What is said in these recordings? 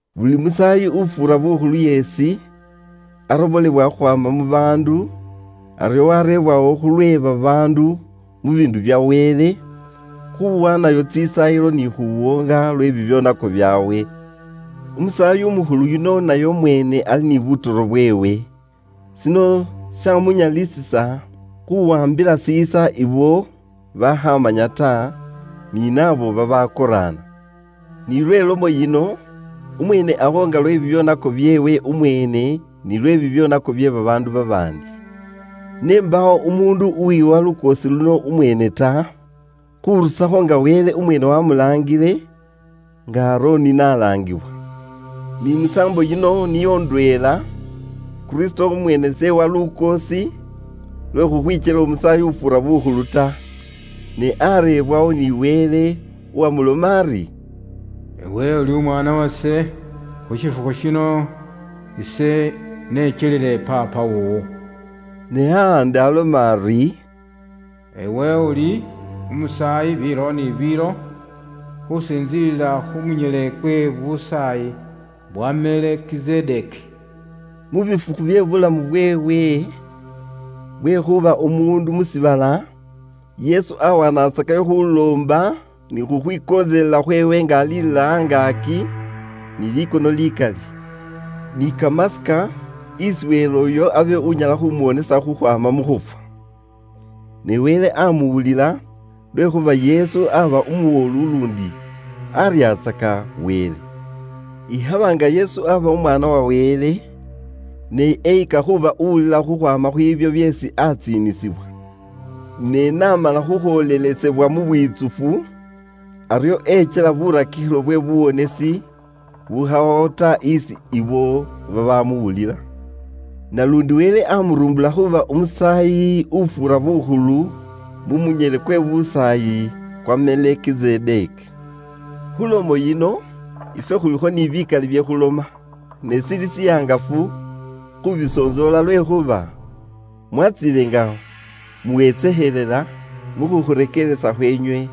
Buli musaayi ufuura bukhulu yeesi arobolewa khukhwaama mu baandu, aryo wareebwawo khulwe babaandu mu biindu bya Wele, khuwaanayo tsisaayilo ni khuwoonga lwe bibyoonako byaabwe. Umusaayi umukhulu yuno naye umweene ali ni butoro bweewe. Shino shamunyalisisa khuwaambila shiisa ibo babaakhamanya ta, ni naabo babakoraana. Ni lwe lomo yino, umweene awoonga lwe bibyoonako byeewe umweene nilwe bibyoonako bye babaandu babaandi. Ne mbaawo umuundu uwiha lukoosi luno umweene ta, khurusakho nga Wele umweene wamulaangile, nga Aroni n'alaangibwa. Ni musaambo yino niyo ndweela, Kristo umweene s'ewa lukoosi lwe khukhwikyela Umusaayi ufuura bukhulu ta, ne areebwawo ni Wele uwamuloma ari, “Iwe uli Umwaana wase, khu shifukhu shino ise nekyelile Paapa woowo.” Ni ahandi aloma ari, “Iwe uli umusaayi biilo ni biilo, khusintsiila khu munyele kwe busaayi bwa Melekizedeki.” Mu bifukhu bye buulamu bweewe bwe khuuba umuundu mu shiibala, Yesu awanatsakayo khuloomba ni khukhwikontselela khweewe nga alilila angaaki ni likono likali, ni kamasika, isi Wele uyo abe unyala khumuwonesa khukhwaama mu khufwa. Ne Wele amuwulila lwekhuuba Yesu aba umuwolu luundi aryatsaka Wele. Ikhaba nga Yesu aba umwaana wa Wele, ne eyika khuuba uwuulila khukhwaama khwiibyo byeesi atsiinisibwa. Ne n'amala khukhwoolelesebwa mu bwitsufu, aryo ekyela burakikhilo bwe buwonesi bukhawawo ta isi ibo babamuwulila. Naluundi Wele amuruumbula khuuba Umusaayi ufuura bukhulu mu munyele kwe busaayi kwa Melekizedeki. Khulomo yino, ifwe khulikho na bikali bye khuloma, ne shili shihangafu khubisontsoola lwekhuuba mwatsiile nga muwetsekhelela mu khukhurekeeresa khweenywe.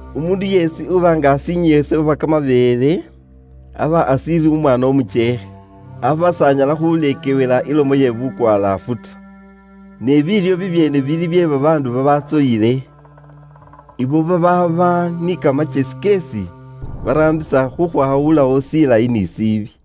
Umuundu yeesi uba nga ashinyweesebwa kamabeele, aba ashiili umwaana umukyeekhe, aba s'anyala khuleekewela ilomo ye bukwalaafu ta. Ne biilyo bibyeene bili bye babaandu babatsoyile, ibo babaaba ni kamakyesi keesi baraambisa khukhwawulawo shilayi ni shiibi.